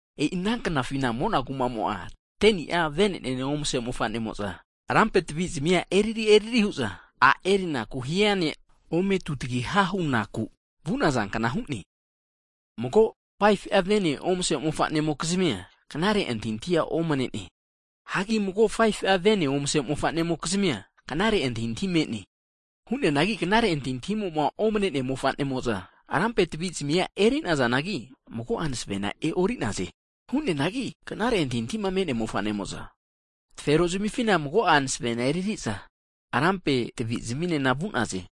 E'i ana knafina mona kumamo'a 10ni'a venenene omase mofanemo'za lampe tavizami'a eriri eriri huza, a' erinaku hia ne' ome tutagiha hunaku vu'naza kna hu'ne. Mago 5fu'a vene omase mofane'mokizmia knare antahintahia omanene. Hagi mago 5fu'a vene omase mofane'mokizmia knare antahintahi me'ne. Hu'neanagi knare antahintahima omanenea mofane'mo'za rampe tvi zamia eri'nazanagi, mago'a masevena e'orinaze. Hu'neanagi knare antahintahima me'nea mofane'mo'za tafero zamifina mago'a masevena eririza rampe tvi zaminena vu'naze.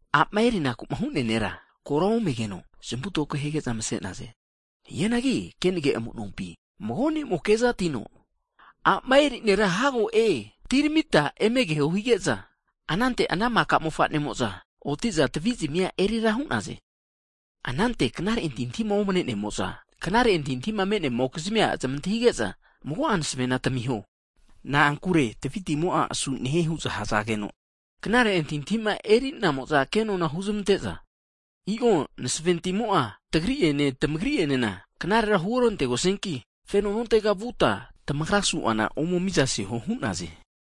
A'ma erinaku'ma hu'nea nera kora omegeno zamu toko hige'za mse'naze. Hianagi kenage amu'nompi mago ne'mo kezatino, A'ma eri nera hago e'ne! Atiramita eme keho! Hige'za, anante ana maka mofanemo'za oti'za tvi' zimi erira hu'naze. Anante knare antahintahima omane'nemo'za, knare antahintahima me'nemokizmia zmantahige'za, mago'a masavena tamiho, na'ankure tvi timo'a asu nehie huza hazegeno, knare antahintahima eri'namo'za kenona huzamante'za, i'o masave timo'a tmagri'ene tagrienena knarera huorantegosianki, feno nontega vuta, tamagra su'zana ome miza seho hu'naze.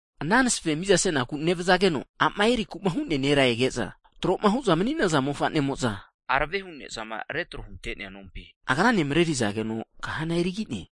Ana masave mizasenaku nevzageno, a'ma eriku'ma hu'nea nera ege'za, tro'ma hu'za mani'naza mofa'nemo'za, aravehu ne'zama retro hunte'nea nompi agrane marerizageno kahana erigi'ne.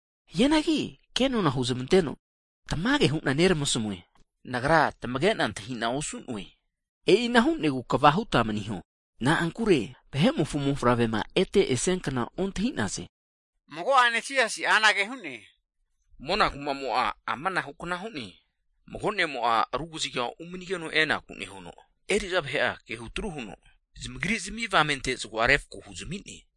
Hianagi ke nona huzamanteno, tamage hu'na neramasmue, nagra ontamage'noe huno hu'ne. E'ina hu'negu kva huta maniho, na'ankure Vahe'mofo Mofavrema ete esiankna ontahi'naze. Mago'ane Mona kuma'mo'a amanahukna hu'ne, Mago ne'mo' ru kaziga umanigeno enaku nehuno, eri'za vahe'a kehutru huno, zamagri'zmi avamente zago'a refako huzami'ne.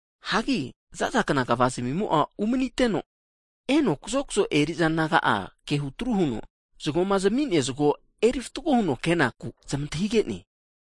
Hagi zazakna kva zimimo'a umaniteno, eno kazokzo eri'za naga'a ke hutru huno, zgoma zami'nea zgo eri fatgo huno kenaku zmantahige'ne.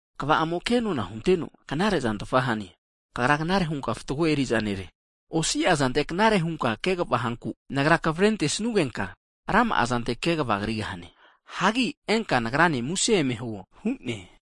kva'amo'a kenona hunteno, knare'zantfa hane, kagra knare hunka fatgo eri'za nere. Osi'a zantera knare hunka kegva hanku, nagra kavare antesnugenka rama'a zante kegva krigahane. Hagi enka Nagrane muse eme huo hu'ne.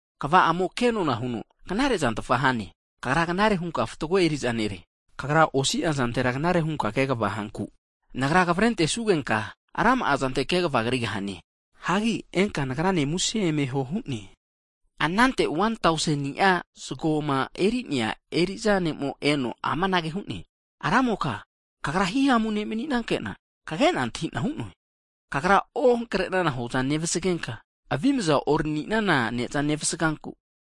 kva'amo ke nona huno, knare'zantfa hane, kagra knare hunka fatgo eriza nere, osi'a zantera knare hunka kegva hanku, nagra kavere antesnugenka rama'a zante ke kva krigahane. Hagi enka Nagranena musena eme huo hu'ne. Anante 1tauseni'a zgoma eri'nea eri'za ne'mo eno amanage hu'ne, Ramoka kagra himamu ne' mani'nankena kage'na antahi'na hu'noe, kagra ohankre'nana hoza nevsagenka, avimza orani'nana ne'za nevasganku,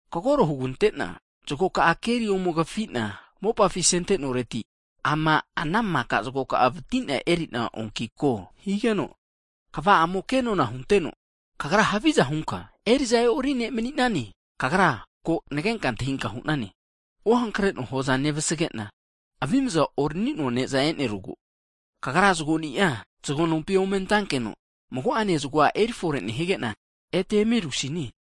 kagoro hugante'na zgoka'a keri ome kafi'na mopafi asente'noreti, ama ana maka zago ka'a vati'na eri'na oanki ko higeno, kva'amo ke nona hunteno, kagra haviza hunka, eriza e'ori ne' mani'nane. Kagra ko nagenka nantahinka hu'nane, ohankre'noa hoza nevasage'na, avimza orani'noa ne'za enerugu, kagra zgoni'a zgo nompi ome ante'nankeno, mago'ane zgoa erifore nehige'na, ete eme eruresine.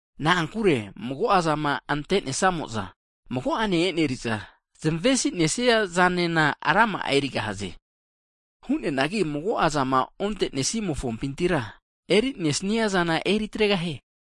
Na'ankure, mago'azama ante'nesamo'za mago'ane eneri'za, zmesi' nesiazana rama'a erigahaze. Hu'neanagi mago'a zama onte'nesimofompintira eri'nesnia zana eritregahie.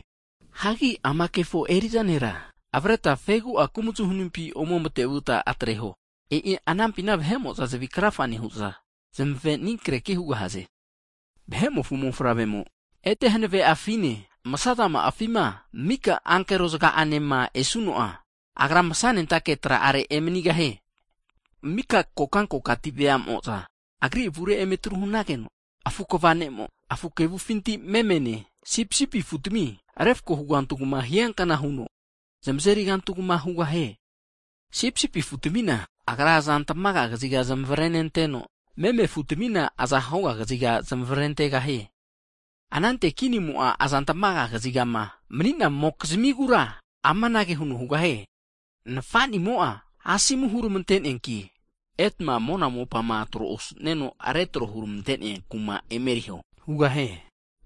Hagi ama kefo eri'za nera avreta fegi'a kumzu hanimpi ome matevuta atreho, e'i anampina vahe'mo'za zavi krafa nehu'za, zmave anikreki hugahaze. Vahe'mofo Mofavremo ete hanave'afine msa zama'afima mika ankero zga'anema esuno'a, Agra masa nentake tra'are emanigahie. Mika kokankokati vea'mo'za Agri avure emeritru hanageno afu kva nemo, afu kevufinti memene sipisipi afutmi refako hugantugma hiankna huno, zamazeri kantugma hugahie. Sipisipi afu'tmina, Agra aza tamaga kaziga zmavrenenteno, meme afutmina aza hoga kaziga zamavrentegahie. Anante kinimo'a azantmaga kazigama mani'namokizimigura amanage huno hugahie. Nafa'nimo'a asomu huramante'neanki, etma mona mopa tro osu'nenoma retro huramante'nea kuma emeriho hugahie.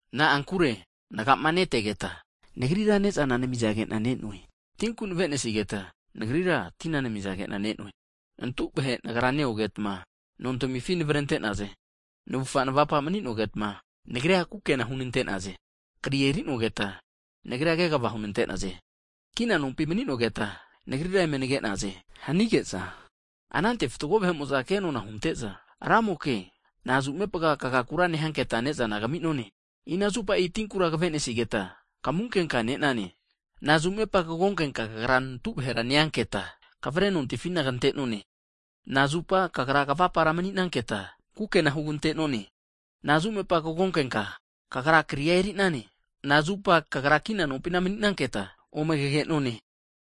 Na'ankure nga'ma'netegeta Nagrira ne'za namizage'na ne'noe. Tinku nave'nesigeta Nagrira tina namizage'na ne'noe. Nantu vahe Nagra neogetma nontamifi navrente'naze. Navufa navapa mani'nogetma Nagrira kukena hunante'naze. Kri eri'nogeta Nagrira kegva hunante'naze, Kina nompi mani'nogeta, Nagrira eme nage'naze hanige'za, anante fatgo vahe'moza ke nona hunte'za, Ramoke, nazumepaga kagakura nehanketa ne'zana kami'none? Inazupa tinkura kave'nesigeta, kamunkenka ne'nane? Nazumepaga kagonkenka Kagra nantu vahera neanketa kavare nontifina kante'none? Nazupa Kagra kavufa kavapara mani'nanketa, kukena hugante'none? Nazumepaga kagonkenka, Kagra kria eri'nane, nazupa Kagra kina nompina mani'nanketa, ome kagenone?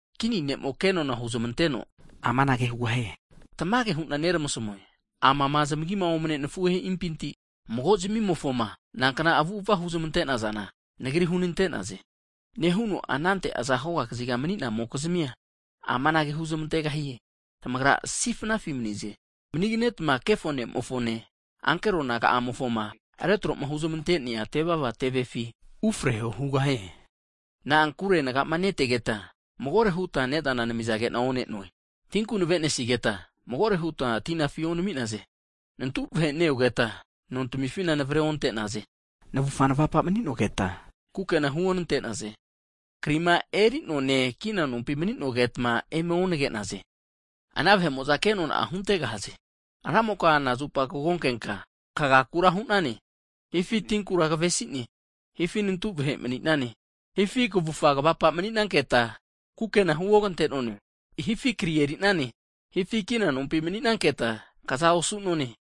Kini ne'mo kenona huzmanteno amanage hugahie, tamage hu'na neramasamue, amama zmagima omane nafuhe'impinti mago zmimofoma nankna avu'ava huzmante'nazana, Nagri hunante'naze. Nehuno anante aza hoga kazigama mani'namokizmia amanage huzmantegahie, tamagra kazusifi mani'naze, maniganeta kefo nemofone, ankero naga'amofoma retro'ma huzmante'nea tevava tevefi ufreho. Na'ankure naga'ma netegeta magore hutma ne'zana namizage'na one'noe, tinku nave'nesigeta magore hutma tina afi onami'naze. Nantu vahe neogeta nontimifina navre onte'naze. Navufa navapa mani'nogetma kukena huonante'naze. Krima eri'noane, kina nompima maninogeta eme onage'naze. Ana vahe'mo'za ke nona huntegahaze, Ramoka, nazu'mepa kagonkenka kagakura hu'nane, hifi tinkura kavesi'ne, hifi nantu vahe e'nane, hifi kavufa kavapa mani'nanketa, kukena huogante'none, hifi kria eri'nane, hifi kina nompina mani'nanketa kza osu'none?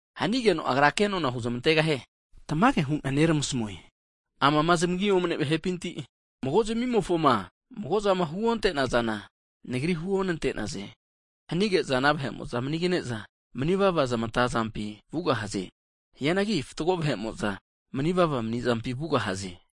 Hanageno Agra ke nona huzmantegahie. Tamage hu'na neramasmue, amama zamagi omne'nea vahe'pinti, mago zmimofoma mago'zama huonte'nazana, Nagri huonte'naze. Hanige'za ana vahe'mo'za manigane'za mani'vava zamatazampi vugahaze. Hianagi fatgo vahe'mo'za mani'vava mani'zampi vugahaze.